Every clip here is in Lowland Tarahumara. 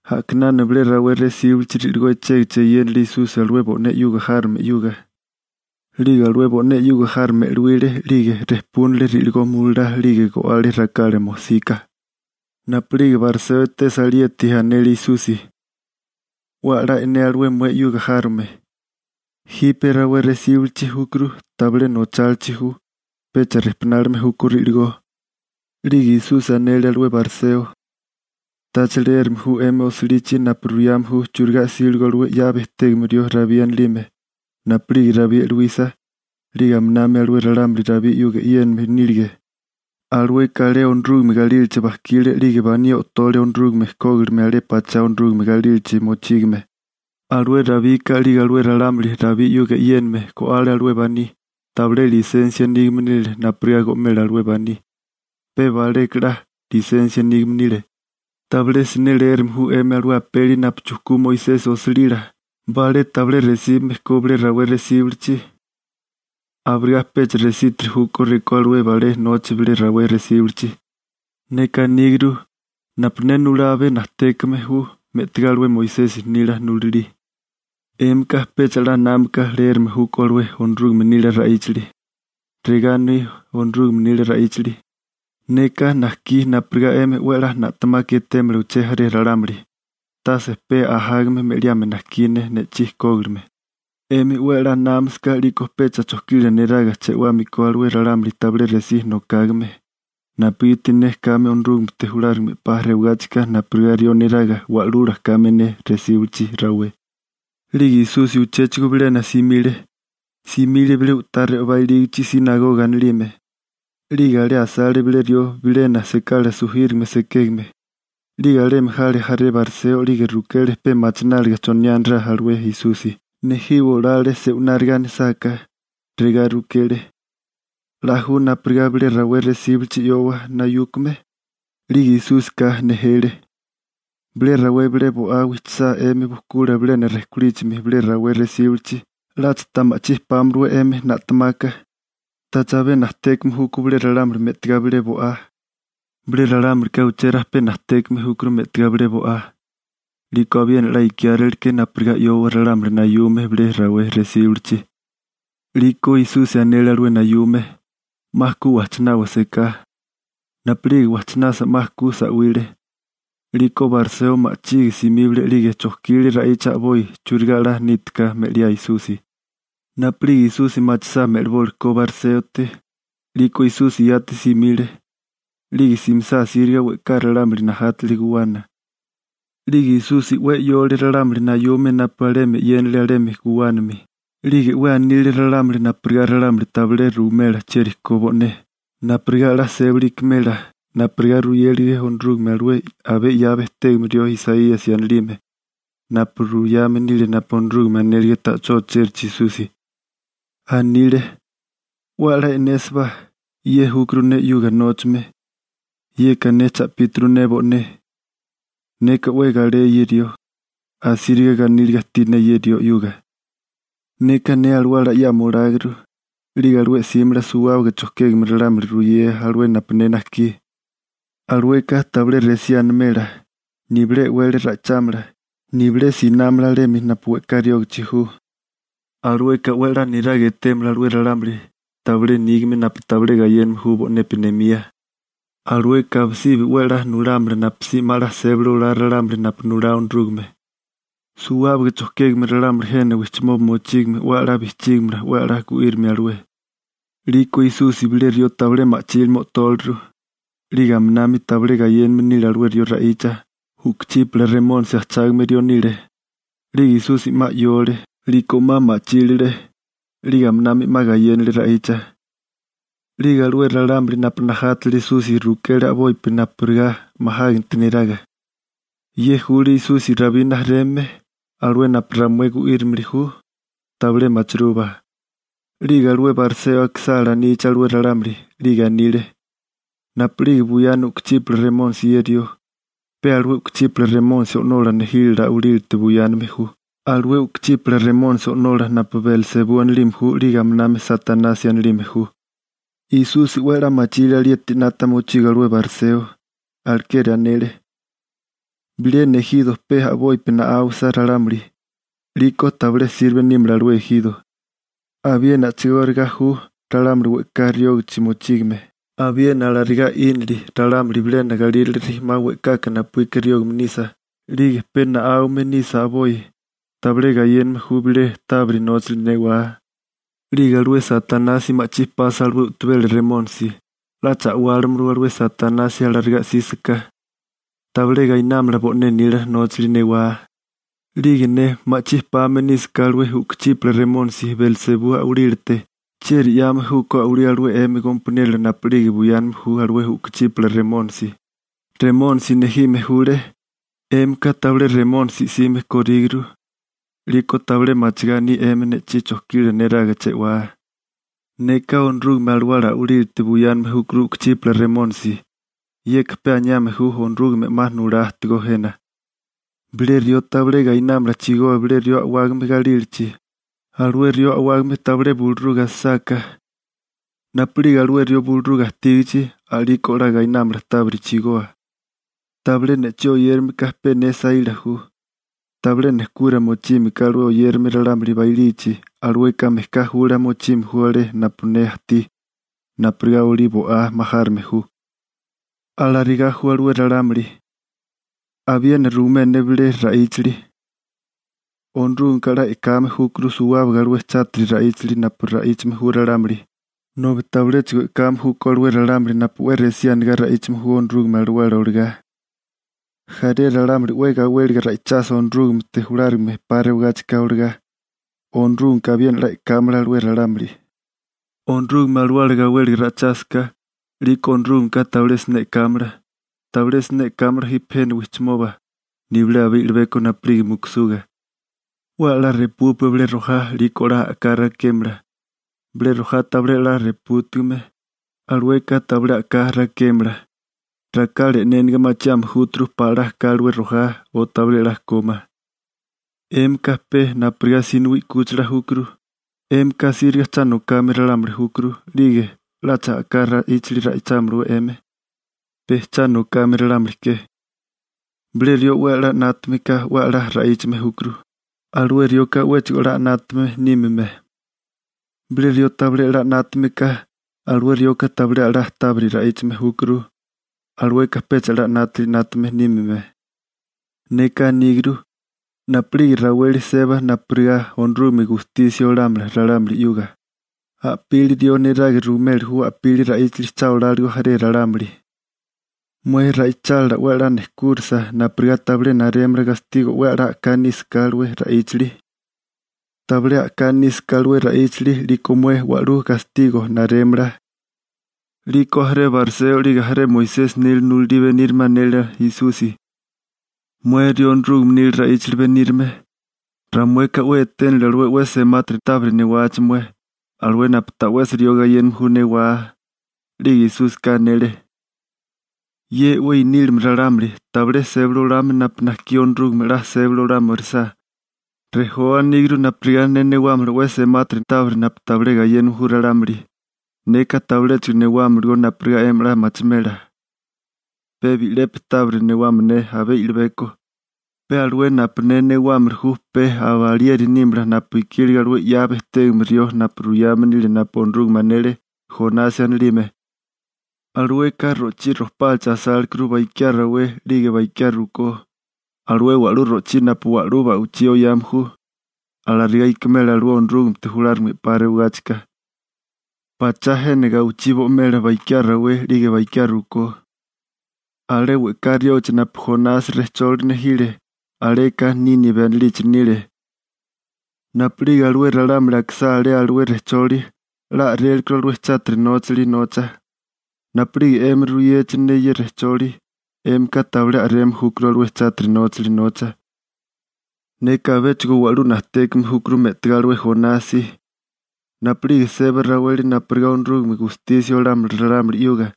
A'kinana bilé rawé resíbalichi ri'ligó echégachimi eyénale Esusi alué bo'né 'yuga járome 'yuga. 'Lige alué bo'né 'yuga járome e'luíle 'lige rejpúnele ri'ligó mulalá 'lige go'ale rakala mojsika. Napu'lige bariseo etesa alieti, anele Esusi: ―'We a'lá e'né alué mué 'yuga járome. Jipe rawé resíbilichi júkuru tabilé nochálichi ju, pecha rijpunálime júkó ri'ligó. 'Lige Esusi anele alué bariseo: ―¿Tacha leérame ju 'emi osilichi napu ruyame ju churigá 'síligo alué 'ya bejtégame rió Rabí anilime napu'lige Rabí e'luísa 'lige aminami alué ralámuli Rabí 'yuga e'yéname nílige? Alueka alé Onorúgame galílachi bajkile 'lige baní o'tole Onorúgame kógilime alé pachá Onorúgame galílachi mochígame. Alué Rabika 'lige alué ralámuli Rabí 'yuga e'yéname go'ale alué baní, tabilé lisensia nígame nile napurigá go'mela alué baní, pe baleka 'la lisensia nígame nile. ¿Tabilé siné leérame ju 'emi alué apeli napu chujkú Moisesi osilila, balé tabilé resíbame ko bilé rawé resíbilichi? Abirigá pecha resítiri júkó rekó alué balé noche bilé rawé resíbilichi. Neka aníguru, napu ne nulá abé najtékame ju me'tigá alué Moisesi nila nulalí. 'Émika pecha 'la námaka leérame júkó alué Onorúgame nila ra'íchali. Regá aní Onorúgame nila ra'íchali: «Neka najkí napurigá 'emi 'we na'temaka etémala uché jaré ralámuli, tase pe ajágame me'liame najkí ne ne'chí kógilime.» 'Emi 'we a'lá námasaká 'liko pecha chojkila neraga che'wámiko alué ralámuli tabilé resí nokágame, napugiti ne kame Onorúgamete julárigame 'pa rewagáchika napurigá rió neraga wa'lula kame ne resíbalichi rawé. 'Lige Esusi uchéchigo bilena simile, simile bilé u'tá re'obá ilígichi «sinagoga» anilime. 'Lige alé asale bilé rió bilena sekala sujírigame sekégame, 'lige alemi jale jaré bariseo 'lige rukele pe machináliga choniá anirá alué Esusi, nejiwa olale se'wináriga anisáká. Regá rukele: ―¿'La ju napurigá bilé rawé resíbilichi 'yowa nayúkame? 'Lige Esúsika nejele: ―Bilé rawé bilé bo'á wijchisá 'emi bujkula bilena rejkolíchimi bilé rawé resíbilichi, ¿'Lacha ta ma'chí pámala 'we 'emi na'temaka? ¿Tacha abé najtékame júkó bilé ralámuli me'tigá bilé bo'á? Bilé ralámulika uché rajpé najtékame júkuru me'tigá bilé bo'á. 'Liko abiena 'la ikiáréleke napurigá 'yowa ralámuli nayume bilé rawé resíbilichi. 'Liko Esusi anele alué nayume: ―'Ma ku wajchinábá seká. Napu'lige wajchinasa 'ma ku sa'wile. 'Liko bariseo ma'chige simíbale 'lige chojkile ra'icha a'boi churigá 'la nítiká me'liá Esusi. Napu'lige Esusi machisá me'libólikó bariséote, 'liko Esusi yati simile. 'Lige simisá asíriga we'ká ralámuli najátele guwana. 'Lige Esusi 'we 'yole ralámuli nayume napu alemi e'yénale alemi guwánami, 'lige 'we anile ralámuli napurigá ralámuli tabilé ruwimela chieri ko bo'né, napurigá 'la sébali ikimela napurigá ruyélege Onorúgame alué abé 'ya bejtégame rió Isaíasi anilime napu ruyame nile napu Onorúgame anélige ta'chó ochérachi Esusi. Anile: 'We a'lá e'nésibá. Ye júkuru ne 'yuga nóchame. Yeka ne cha'píturu ne bo'né. Neka 'we galé ye rió, asíriga ganíliga ajtí ne ye rió 'yuga. Neka ne alawala 'yama oláguru. 'Lige alué 'símala suwábaga chojkégame ralámuli ruyea alué napu ne najkí. Alueka tabilé resí animela, nibilé e'wele ra'ichámala, nibilé sinámala alemi napu we'ká riógachi ju. Alueka 'we a'lá niraga etémala alué ralámuli tabilé nígame napu tabilé gayéname ju bo'nepi nemía. Alueka abisibi 'we nulámala napusí 'ma a'lá sébali olá ralámuli napu nulá Onorúgame. Suwábaga chojkégame ralámuli jena wijchimoba mochígame 'we a'lá bijchígimala 'we a'lá gu'írimia alué. 'Liko Esusi bilé rió tabilé machílime o'tóleru, 'lige aminami tabilé gayéname nile alué rió ra'icha, u'kuchípala remónisi ajchágame rió nile. 'Lige Esusi 'ma 'yóole, 'liko 'ma ma'chílile, 'lige aminami 'ma gayénale ra'icha. 'Lige alué ralámuli napu najátale Esusi rukele a'bopi napurigá majáganti neraga: ―¿Ye jule Esusi Rabí rijimala, alué napu ramué gu'írimili ju? Tabilé machirúbá. 'Lige alué bariseo akisá alanichi alué ralámuli, 'lige anile: ―Napu'lige buyana u'kuchípala remónisi ye rió, pe alué u'kuchípala remónisi o'nola nejílala a'walite buyáname ju, alué u'kuchípala remónisi o'nola napu Belsebú anilime ju 'lige aminami Satanasi anilime ju. Esusi 'we a'lá machile alieti 'nata mochigo alué bariseo, alekeri anele: ―Bilena ejiro pe a'bopi na'áwasa ralámuli, 'liko tabilé sirbe nímala alué ejiro. Abiena a'chigóriga ju ralámuli we'ká riógichi mochígame, abiena alarigá 'ínili ralámuli bilena galírale rijimá we'kaka napuíka riógame nisa 'lige pe na'áwame nisa a'boi, tabilé gayéname ju bilé tábiri nóchali newá. 'Lige alué Satanasi ma'chí pasa alué u'tabela remónisi, ¿'lacha a'wálimalawé alué Satanasi alarigá 'sísaká? Tabilé gainámala bo'né nila nóchali newá. 'Lige ne ma'chí pame nísaká alué u'kuchípala remónisi Belsebú a'walílate, ¿chieri 'yame júkó a'walí alué 'emi gompaniérola napu'lige buyáname ju alué u'kuchípala remónisi? Remónisi nejime júlé. 'Émika tabilé remónisi 'sime kóríguru. 'Liko tabilé machigá aní 'emi ne'chí chojkila neraga che'wáa. Neka Onorúgame Alawala a'walílate buyáname júkuru u'kuchípala remónisi. Yeka pe aniame ju Onorúgame 'ma nulá ajtigó jena. › Bilé rió tabilé gainámala chigoa bilé rió a'wágame galílachi, alué rió a'wágame tabilé buluruga asisáká. Napu'lige alué rió buluruga ajtígichi, a'liko 'la gainámala tábiri chigoa. › Tabilé ne'chí oyérame ka pe ne saíla ju. Tabilé nejkura mochime ka alué oyérame ralámuli bailichi, alueka mejká jula mochime ju alé napu ne ajtí, napurigá olí bo'á majárime ju. Alarigá ju alué ralámuli. › Abiena ruimé ne bilé ra'íchali: Onorúgameka 'la e'kame júkuru suwábaga alué chátiri ra'íchali napu ra'íchame ju ralámuli, nobi tabiléchigo e'kame júkó alué ralámuli napu 'we resí anegá ra'íchame ju Onorúgame Alawala olagá. Jaré ralámuli 'we gawéliga ra'ichasa Onorúgamete julárigame 'pa rewagáchika olagá, Onorúgameka abiena 'la e'kámala alué ralámuli. Onorúgame Alawala gawéliga ra'ichásaká, 'liko Onorúgameka tabilé siné e'kámala. Tabilé siné e'kámala jipe jena wijchimoba nibilé abé i'libeko napu'lige mukusuga. › 'We a'lá repúpua bilé rojá 'liko 'la a'ká rakémala. Bilé rojá tabilé a'lá repútigame, alueka tabilé a'ká rakémala. Rakala e'néniga machiame júturu pala 'la ka alué rojá o tabilé 'la ko ma. ¡'Émika pe napurigá sinowí 'kúchila júkuru! 'Émika asíriga cha nokame ralámuli júkuru, 'lige ¿'lacha a'ká ra'íchali ra'ichámiliwé 'emi, pe cha nokame ralámuli ke? Bilé rió 'we a'lá 'nátame ka 'we a'lá ra'íchame júkuru, alué rioka 'wéchigo a'lá 'nátame nímime. Bilé rió tabilé a'lá 'nátame ka, alué rioka tabilé a'lá tábiri ra'íchame júkuru, alueka pecha a'lá 'nátili 'nátame nímime. Neka aníguru, napu'lige raweli sébasa napurigá Onorúgame gustisia olámala, a'pílipi rió neraga ruimeli ju cha anigá eyéniligó. Mué ra'ichálila 'we a'lá nejkúrisa napurigá tabilé narémala gastigo 'we a'lá a'ká nísaká alué ra'íchali. Tabilé a'ká nísaká alué ra'íchali, 'liko mué wa'lú gastigo narémala. 'Liko jaré bariseo 'lige jaré Moisesi nila nulalí benírame anele Esusi: ―Mué rió Onorúgame nila ra'íchali benírame, ramueka 'we eténili alué 'we semátiri tábiri newachi mué, alué napu ta'wesi rió gayéname ju newá. 'Lige Esúsika anele: ―Ye 'we i'nílime ralámuli, tabilé sébali olame napu najkí Onorúgame 'la sébali olámirisá, rejoa aníguru napurigá ne newámala 'we semátiri tábiri napu tabilé gayéname ju ralámuli. Neka tabiléchigo newámalagó napurigá 'emi 'la machimela. Pe bi'lepi tábiri newámala ne abé i'libeko, pe alué napu ne newámili ju pe aba alieri nímala napu ikílige alué 'ya bejtégame rió napu ruyame nile napu Onorúgame anele, Jonasi anilime. Alueka ro'chí rojpálichi asálekurú bakiá rawé 'lige bakiá rukó, alué wa'lú ro'chí napu wa'lú ba'wichí oyame ju. Alarigá ikimela alué Onorúgamete julárigame 'pa rewagáchika, pachá jena gawichí bo'imela bakiá rawé 'lige bakiá rukó. Alé we'ká riógichi napu Jonasi rejcholi nejile, aleka Nínibe anilichi nile. Napu'lige alué ralámuli akisá alé alué rejcholi, 'la a'rélekuru alué chátiri 'nátali 'nata. Napu'lige 'emi ruyechi ne ye rejcholi, 'émika tabilé a'reme júkuru alué chátiri 'nátali 'nata. Neka abéchigo wa'lú najtékame júkuru me'tigá alué Jonasi. Napu'lige seba raweli napu Onorúgame gustisia olámala alué ralámuli chátiri 'nátame,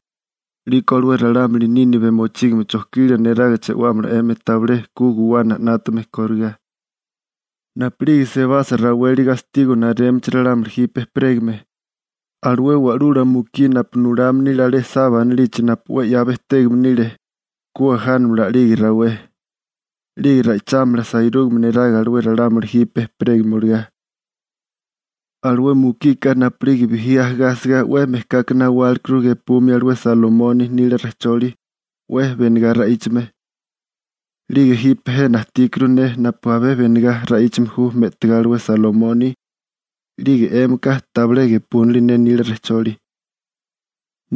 'liko alué ralámuli Nínibe mochígame chojkila neraga che'wámala 'emi tabilé ku guwana 'nátame koriká. Napu'lige sebasa raweli gastigo (juicio) narémichi ralámuli jipe ejperégame, alué wa'lula mukí napu nulame nile alé Saba anilichi napu 'we 'ya bejtégame nile ku ajánamala a'lige rawé, 'lige ra'ichámala sairúgame neraga alué ralámuli jipe ejperégame olagá. Alué mukika napu'lige bijí ajagá asigá 'we mejkaka nawálekuru gepumia alué Salomoni nila rejcholi 'we benegá ra'íchame, 'lige jipe jena ajtíkuru ne napu abé benegá ra'íchame ju me'tigá alué Salomoni, 'lige 'émika tabilé gepúnili ne nila rejcholi. ›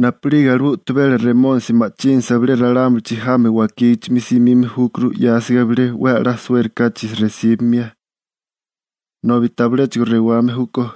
Napu'lige alué u'tabela remónisi ma'chínasa bilé ralámulichi jami wakígichimi simime júkuru 'yásiga bilena 'we a'lá suérikáchi resíbamia, nobi tabiléchigo rewame júkó.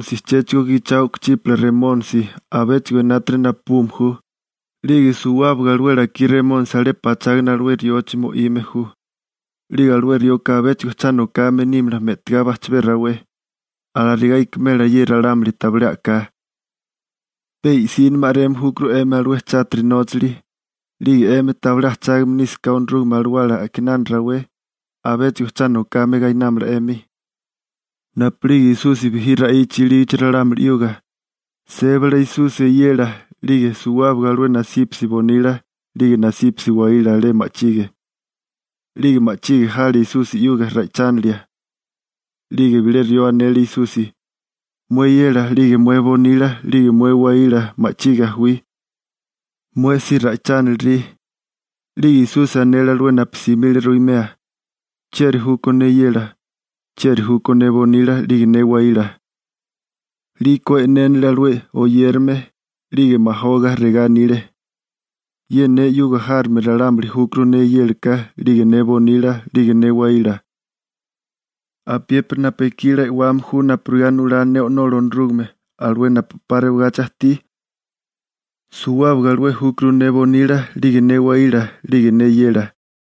'Liko alué u'tabela remónisi chéchigo gichao u'kuchípala remónisi, abéchigo enátiri napabume ju, 'lige suwábaga alué lakí remónisi alé pachágana alué riochi mo'ime ju. 'Lige alué rioka abéchigo cha nokame nímala me'tigá bajchabé rawé. Alarigá ikimela ye ralámuli tabilé a'ká. Pe i'sínimi a'reme júkuru 'emi alué chátiri nóchali, 'lige 'emi tabilé ajchágame nísaká Onorúgame Alawala a'kinana rawé, abéchigo cha nokame gainámala 'emi. Napu'lige Esusi bijí ra'icha ilígichi ralámuli 'yuga, sébale Esusi eyela 'lige suwábaga alué nasípasi bonila 'lige nasípasi waíla alé ma'chige. 'Lige ma'chige jale Esusi 'yuga ra'ichánilia. 'Lige bilé rió anele Esusi: ―Mué eyela 'lige mué bonila 'lige mué waíla ma'chige jawí, mué si ra'ichánilirí. 'Lige Esusi anele alué napu simile ruimea: ―¿Chieri júkó ne eyela, chieri júkó ne bonila 'lige ne waíla? 'Liko e'nénele alué oyérame, 'lige majoga regá anile: ―Ye ne 'yuga járome ralámuli júkuru ne eyélaka 'lige ne bonila 'lige ne waíla. Apiépiri napu ekí 'la e'wame ju napurigá nulá ne O'nola Onorúgame, alué napu 'pa rewagachi ajtí, suwábaga alué júkuru ne bonila 'lige ne waíla 'lige ne eyela.